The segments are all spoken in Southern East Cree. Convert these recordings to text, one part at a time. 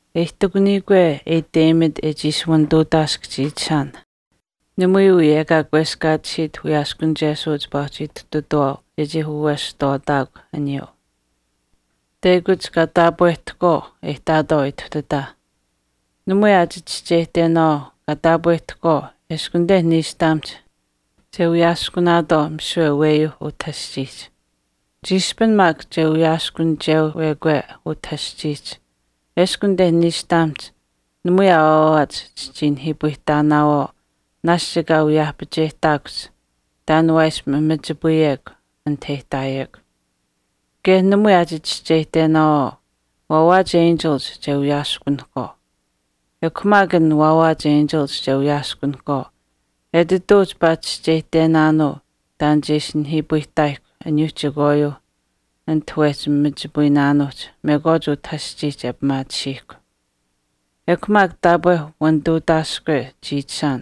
E ihtakuniyikwe e iteyimat e chii ishi wanituutaask chiichishaan namui wii ekaa kweskaatisiit wiyaaskunichesuu chipaa uhchi ituhtatuwaau chechii waweshihtwaataakw aniyuu. Teyakuch kaa taapwehtahkwaauh e ihtaatwaau ituhtataah. Namui aa chichischeyihtenaawaau kaa taapwehtahkwaau eshkw anite niishtamihch che wiyaaskunaatwaau misiwe aweyuuh utah aschiihch kaa ihtaayich. Chiishpin maak che wiyaaskunichewekwe utah aschiihch eshkw anite niishtamihch, namui aa waawaach chichii ihtinaawaau chechii nihiipayihtaatuyekw chekwaan naashch ekaa wiyaahpacheyihtaakuhch taan e ishi mamachipayekw anit e ihtaayekw. Kaye namui aa chichischeyihtenaawaau, waawaach enchilich che wiyaaskunahkwaau. Ekw maak an waawaach enchilich che wiyaaskunahkwaau etituu chipaa chischeyihtenaanuu taan che ishi nihiipayihtaayihkw aniyuuh chekwaayuuh ati wehchi machipayinaanuuhch mekwaach utah aschiihch e pimaatisiihkw. Ekw maak taapwe wenituutaaskwe chiichishaan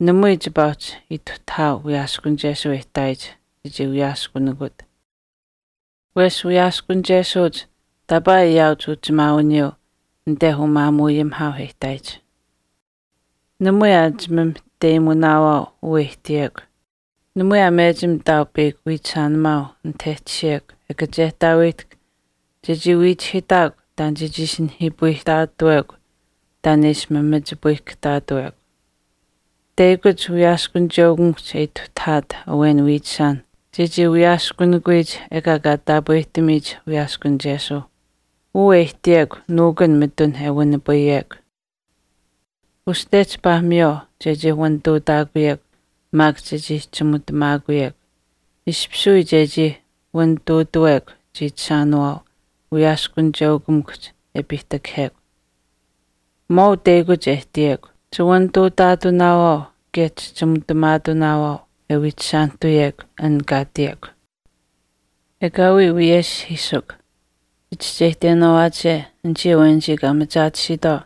namui chipaa uhchi ituhtahaau wiyaaskunichesuu e ihtaayich chechii wiyaaskunikut. Wesh wiyaaskunichesuuch taapaa ayaauch uchimaawiniyuu anite umaamuuayimihaauh e ihtaayich. Namui aa chimamahteyimunaawaau uu e ihtiyekw. Namui aa mechim ihtaau peyakw wiichishaanimaau anit e tashiyekw e kachehtaaweyihtahk chechii wiichihiitaakw taan chechii ishi nihiipayihtaatuwekw taan e ishi mamachipayihkahtaatuwekw. Teyakuch wiyaaskunicheukamikuhch e ituhtahaat awen wiichishaan chechii wiyaaskunikuyich ekaa kaa taapwehtamiyich wiyaaskunichesuu. Uu e ihtiyekw nuukun mitun e wanipayekw. Uste chipaa miywaau chechii wanituutaakuyekw maak chechii chimutamaakuyekw, ishpish wii chechii wanituutuwekw chiichishaanawaau wiyaaskunicheukamikuhch e piihtakahekw. Maau teyakuch e ihtiyekw. Chiwanituutaatunaawaau kaye chichimutamaatunaawaau, e wiichishaanihtuyekw an kaa ihtiyekw. Ekaawii wiyeshihiisukw. Chichischeyihtenaawaache anichii awenich kaa machaatisiitwaau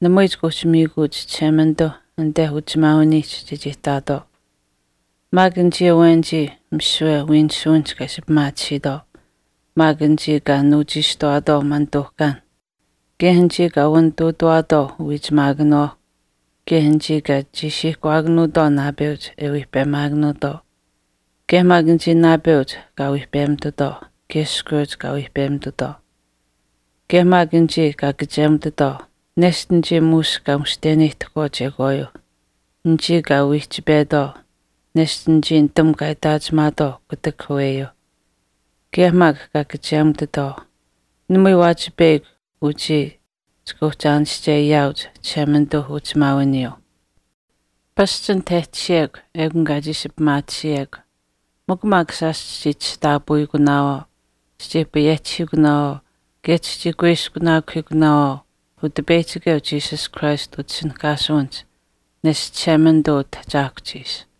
namui chika uhchi miikuuch Chishemanituu anite uchimaawiniihch chechii ihtaatwaau. Maak anichii awenich misiwe wiinisuwinihch kaa ishi pimaatisiitwaau, kaye anichii kaa nuuchiishtuwaatwaau manituuhkaan, kaye anichii kaa wanituutuwaatwaau uwiichimaakanawaauh kaye anichii kaa chiishiihkuwaakanuutwaau naapeuch e wiihpemaakanuutwaau kaye maak anichii naapeuch kaa wiihpemitutwaau, kaye iskweuch kaa wiihpemitutwaau. Kaye maak anichii kaa kachemutitwaau, nesht anichii muush kaa mushteneyihtahkwaau chekwaayuuh, anichii kaa wiihchipetwaau, nesht anichii nitamukw kaa itaachimaatwaau kutak aweyuuh, kaye maak kaa chimutitwaau, namui waachi peyakw uchii chika uhchi aanische ayaauch Chishemanituu uchisheuchimaawiniyuu. Pasch anit e tashiyekw ekun kaa chii ishi pimaatisiyekw. Mikw maak shaash chichii chishtaapawiikunaawaau, chichii payehchihiikunaawaau, kaye chichii kuiskunaakuhiikunaawaau Utipeyihchikeu Jesus Christ utishinihkaasuwinihch neshta Chishemanituu Utahchaahkuhch ishi.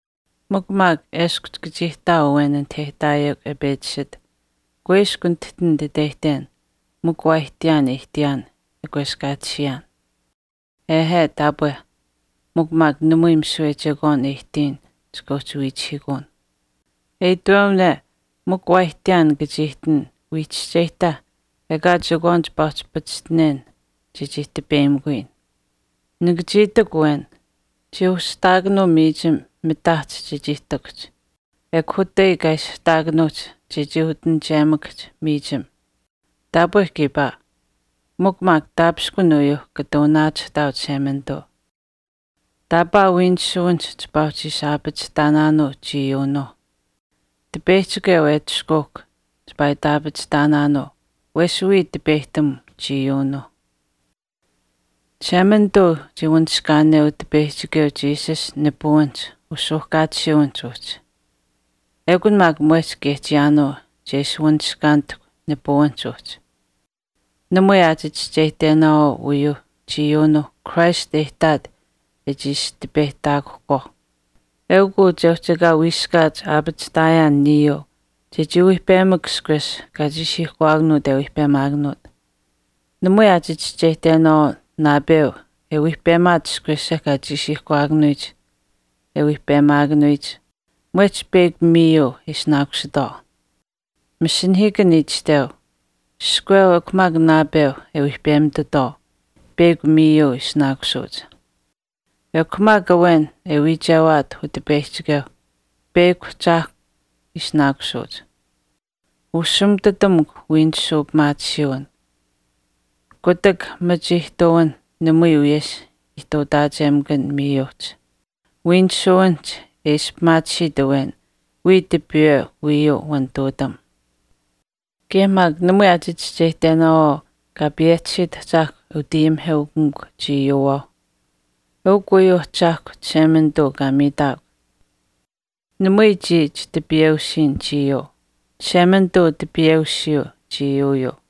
Mikw maak eshkw chika chii ihtaau awen anite e ihtaayekw e pechi iishit, “Kuiskw nitihtin nititeyihten mikw waa ihtiyaan e ihtiyaan e kweskaatisiyaan.” Ehe, taapwe. Mikw maak namui misiwe chekwaan e ihtiyin chika uhchi wiichihiikun. E itwewane mikw waa ihtiyaan nika chii ihtin wii chischeyihta ekaa chekwaan chipaa uhchi pachishtinen chechii tipeyimikuyin. Nika chii itikw awen, “Chii ushihtaakanuu miichim mitaahch chechii ihtakuhch. Ekw utai kaa ishihtaakanuuhch chechii utinichemakahch miichim.” Taapwe kiipaa. Mikw maak taapishkun uyuuh kata wanaachihtaau Chishemanituu. Taapaa wiinisuwinihch chipaa uhchi ishi aapachihtaanaanuu chiiyuunuuh. Utipeyihchikeu e atushkuukw chipaa itaapachihtaanaanuu wesh wiya tipeyihtam chiiyuunuu. Chishemanituu chii wanishkaaneu Utipeyihchikeu Jesus nipuwinihch usuuhkaatisiiwinihch uhchi. Ekun maak mwehch kaye chiyaanuu che ishi wanishkaanihtahk nipuwinihch uhchi. Namui aa chichischeyihtenaawaau uyuuh chiiyuunuuh Christ e ihtaat e ishi tipeyihtaakuhkwaauh. Eukw uu che uhchi ekaa wiiskaat aapachihtaayaan niyuu chechii wiihpemak ishkwesh kaa chiishiihkuwaakanuut e wiihpemaakanuut. Namui aa chichischeyihtenaawaau naapeu e wiihpemaat ishkwesha kaa chiishiihkuwaakanuyich e wiihpemaakanuyich, mwehch peyakw miiyuu ishinaakusuuch. Masinahiikan itashteu, “Iskweu ekw maak naapeu e wiihpemitutwaau, peyakw miiyuu ishinaakusuuch.” Ekw maak awen e wiichewaat Utipeyihchikeu, peyakw ahchaahkw ishinaakusuuch. Ushimututamukw wiinisuu pimaatisiiwin. Kutak machituutamuwinh namui wiyesh ihtuutaachemakanh miiyuuhch. Wiinisuwinihch e ishi pimaatisiit awen wiya tipiiwe wiiyuu wanituutam. Kaye maak namui aa chichischeyihtenaawaau Kaa payehchisiit Ahchaahkw e utayimiheukamikut chiiyuuwaauh. Eukw uyuuh Ahchaahkwa Chishemanituu kaa miitaakw. Namui chii chitipiyeusiin chiiyuu. Chishemanituu tipiweusiyu chiiyuuyuu.